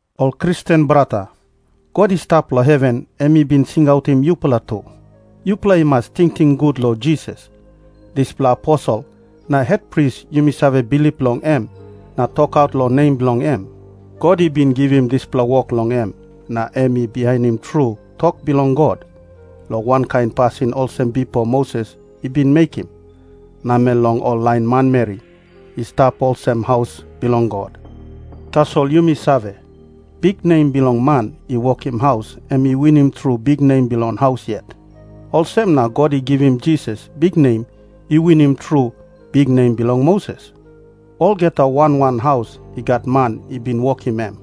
Ol Kristen brata, God i stap long heven em i bin singautim yupela tu. Yupela i mas tingting gut long Jisas, dispela Aposel na Hetpris yumi save bilip long em na tokaut long nem bilong em. God i bin givim dispela wok long em, na em i bihainim tru tok bilong God, long wankain pasin olsem bipo Moses i bin mekim namel long ol lain manmeri i stap olsem haus bilong God. Tasol yumi save, biknem bilong man i wokim haus em i winim tru biknem bilong haus yet. Olsem na God i givim Jisas biknem i winim tru biknem bilong Moses. Olgeta wan wan haus i gat man i bin wokim em.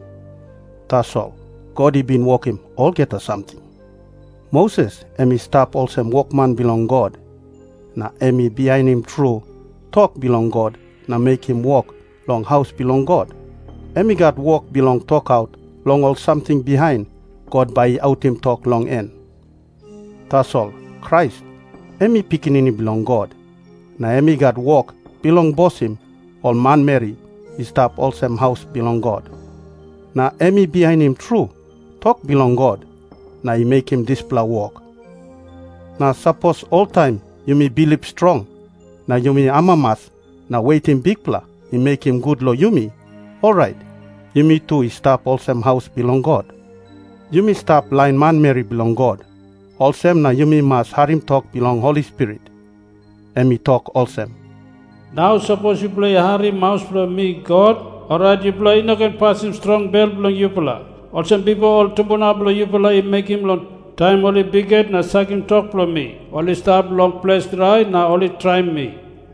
Tasol God i bin wokim olgeta samting. Moses em i stap olsem wokman bilong God, na em i bihainim tru tok bilong God na mekim wok long haus bilong God. Em i gat wok bilong tokaut long ol samting bihain God bai i autim tok long en. Tasol Krais em i Pikinini Bilong God, na em i gat wok bilong bosim ol manmeri i stap olsem haus bilong God. Na em i bihainim tru tok bilong God na i mekim dispela wok. Na sapos oltaim yumi bilip strong na yumi amamas na wetim Bikpela i mekim gut long yumi, orait yumi tu i stap olsem haus bilong God. Yumi stap lain manmeri bilong God, olsem na yumi mas harim tok bilong Holi Spirit. Em i tok olsem, "Nau sapos yupela i harim maus bilong mi God, orait yupela i no ken pasim strong bel bilong yupela, olsem bipo ol tumbuna bilong yupela i mekim long taim ol i bikhet na sakim tok bilong mi. Ol i stap long ples drai na ol i traim mi.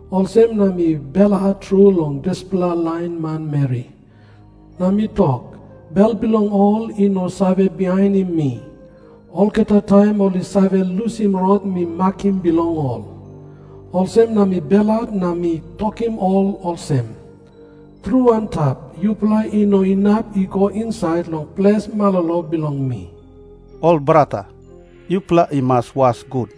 Olsem na mi belhat tru long dispela lain manmeri, na mi tok, 'Bel bilong ol i no save bihainim mi. Olgeta taim ol i save lusim rot mi makim bilong ol.' Olsem na mi belhat na mi tokim ol olsem, 'Tru antap, yupela i no inap i go insait long ples malolo bilong mi.' " Ol brata, yupela i mas was gut.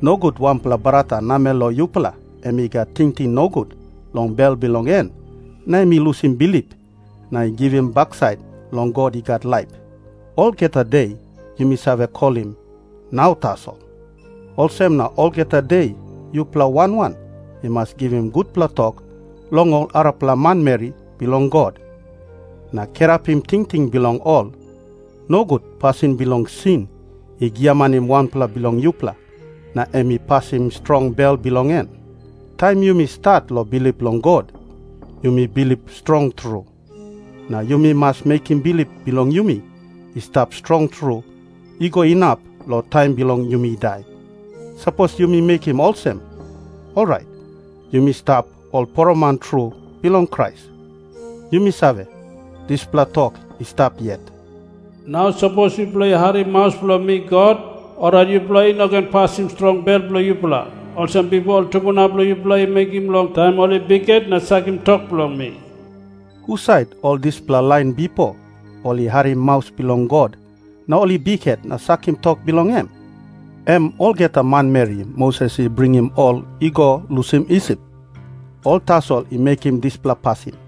Nogut wanpela brata namel long yupela em i gat tingting nogut long bel bilong en na em i lusim bilip na i givim baksait long God i gat laip. Olgeta de yumi save kolim "Nau" tasol. Olsem na long olgeta de yupela wan wan i mas givim gutpela tok long ol arapela manmeri bilong God, na kirapim tingting bilong ol, nogut pasin bilong sin i giamanim wanpela bilong yupela na em i pasim strong bel bilong en. Taim yumi stat long bilip long God, yumi bilip strong tru. Na yumi mas mekim bilip bilong yumi i stap strong tru i go inap long taim bilong yumi dai. Sapos yumi mekim olsem, orait yumi stap ol poroman tru bilong Krais. Yumi save, dispela tok i stap yet, "Nau sapos yupela i harim maus bilong mi God, orait yupela i no ken pasim strong bel bilong yupela, olsem bipo ol tumbuna bilong yupela i mekim long taim ol i bikhet na sakim tok bilong mi." Husat ol dispela lain bipo ol i harim maus bilong God, na ol i bikhet na sakim tok bilong em? Em olgeta manmeri Moses i bringim ol i go lusim Isip. Ol tasol i mekim dispela pasin.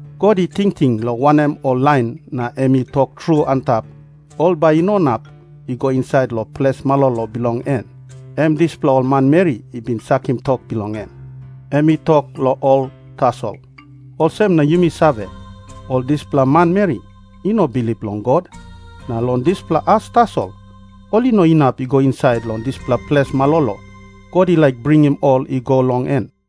God i tingting long wanem ol lain na em i tok tru antap ol bai i no inap i go insait long ples malolo bilong en? Em dispela ol manmeri i bin sakim tok bilong em. Em i tok long ol tasol. Olsem na yumi save, ol dispela manmeri i no bilip long God, na long dispela as tasol ol i no inap i go insait long dispela ples malolo God i laik bringim ol i go long en.